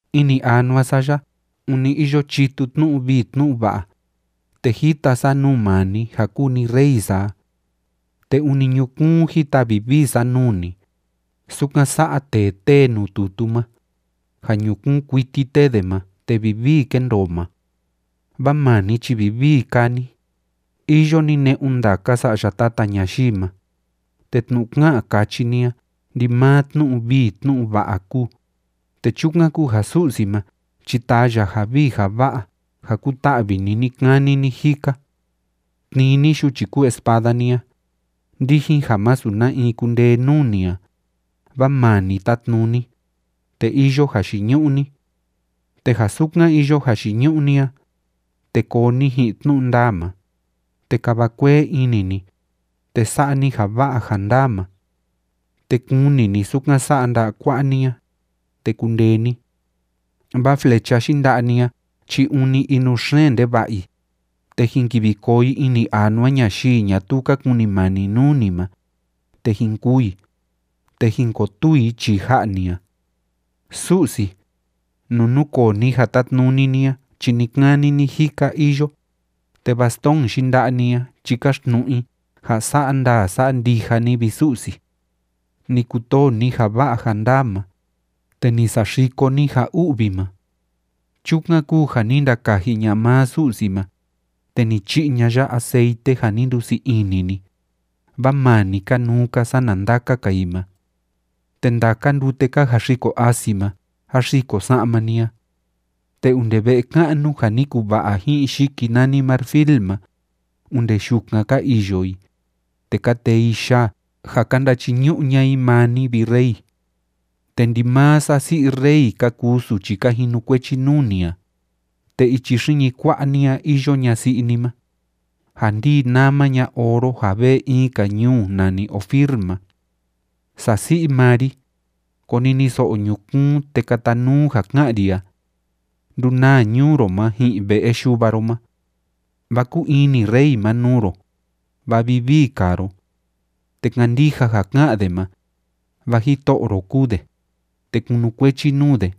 Ini anua sa ya ûni iyo chitu tnu'u vii tnu'u va'a, te jita sa nuu maa ni ja kúu ni Rey sa a. Te ûni ñukuun jita vivii sa nuu ni, sukan sa'a tee tée nuu tutu ma, ja ñukuun kuiti tée de ma te vivii kéndoo ma. Vaa maa ni chi vivii kaa ni, iyo ni ne'un ndaka sa'ya tata ñayii ma, te tnu'u ká'an káchi ni a ndimaa tnu'u vii tnu'u va'a kúu, te chukan kúu ja Su'si ma chi taa ya ja vii ja va'a ja kuta'vi ni ni‑kani ni‑jika. Tnii ni yuchi kúu espada ni a, ndijin ja masu na in kundee nuu ni a, vaa maa ni tátnuni, te iyo jayiñu'u ni. Te ja sukan iyo jayiñu'u ni a, te koo ni ji'in tnu'u ndaa ma, te kava kuee ini ni, te sa'a ni ja va'a ja ndaa ma. Te kuni ni sukan sa'a nda'a kua'a ni a, te kundee ni. Vaa flecha yinda'a ni a chi ûni inuxeen ndeva'a i, te jin kivi koo i ini anua ñayii ñatuu ka kunimani nuu ni ma, te jin kûu i, te jin kotuu i chii ja'a ni a. Su'si, nuu núkoo ni ja tátnuni ni a chi ni‑kani ni‑jika iyo, te bastón yinda'a ni a chi káxtnu'u i ja sa'a ndaa sa'a ndija ni, vi Su'si. Ni kutoo ni ja va'a ja ndaa ma, te ni saxiko ni ja u'vi ma. Chukan kúu ja ni ndakaji ña'a maa Su'si ma, te ni chi'i ña'a ya aceite ja ni ndusii ini ni, vaa maa ni kanuu‑ka sana ndaka‑ka i ma. Te ndaka ndute ka jaxiko asi ma jáxiko sa'ma ni a. Te onde ve'e ka'nu ja ni kuva'a ji'in yiki nani marfil ma, onde yukan ka iyo i, te ka tee i yaa ja ka ndachiñu'u ña'a i maa ni, vi rey. Te ndimaa sasi'i rey ka kuu suchi ka jinukuechi nuu ni a, te ichi xiñi kua'a ni a iyo ñasi'i ni ma, ja ndii nama ña oro ja vee in‑ka ñuu nani Ofir ma. Sasi'i maa ri, koniniso'o ñukuun, te katanuu ja ká'an ri a. Ndunaa ñuu ro ma ji'in ve'e yuva ro ma. Vaa kúu ini rey ma nuu ro, vaa vivii kaa ro. Te kandija ja ká'an de ma, vaa jito'o ro kúu de, te kunukuechi nuu de.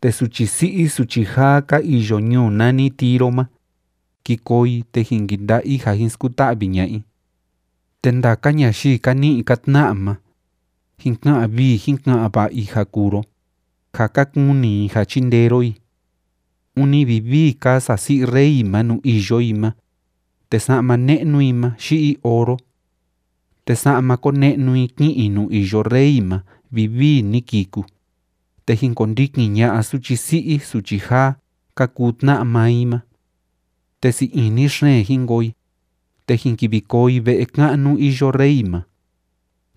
Te suchi si'i suchi jaa ka iyo ñuu nani Tiro ma, ki koo i, te jin kinda'a i ja jin skuta'vi ña'a i. Te ndaka ñayii ka ni'i ka tna'a ma, jin ka'an vii jin ka'an va'a i ja kuu ro, ja ka kuni i ja chindee ro i. Ûni vivii kaa sasi'i rey ma nuu iyo i ma, te sa'ma ne'nu i ma yi'i oro. Te sa'ma kone'nu i ki'in i nuu iyo rey ma vivii ni kiku, te jin kondikin ña'a suchi si'i suchi jaa ka kuu tna'a maa i ma. Te sii ini xeen jin koo i, te jin kivi koo i ve'e ka'nu iyo rey ma.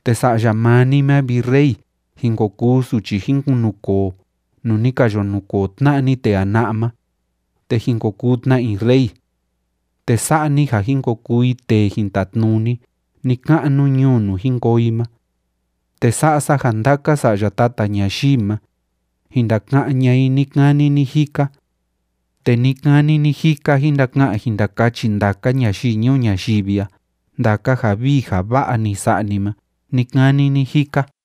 Te sa'ya maa ni ma, vi rey, jin ko kuu suchi jin kunukoo nuu ni ka yo nukoo tna'a ni tee jana'a ma, te jin ko kuu tna i rey. Te sa'a ni ja jin ko kuu i tee jin tatnuni ni‑ka'nu ñuu nuu jin koo i ma. Te sa'a sa ja ndaka sa'ya tata ñayii ma, jin ndaka'án ña'a i ni‑kani ni‑jika. Te ni‑kani ni‑jika jin ndaka'an jin ndakachi ndaka ñayii ñuu ñayivi ya ndaka ja vii ja va'a ni sa'a ni ma ni‑kani ni‑jika.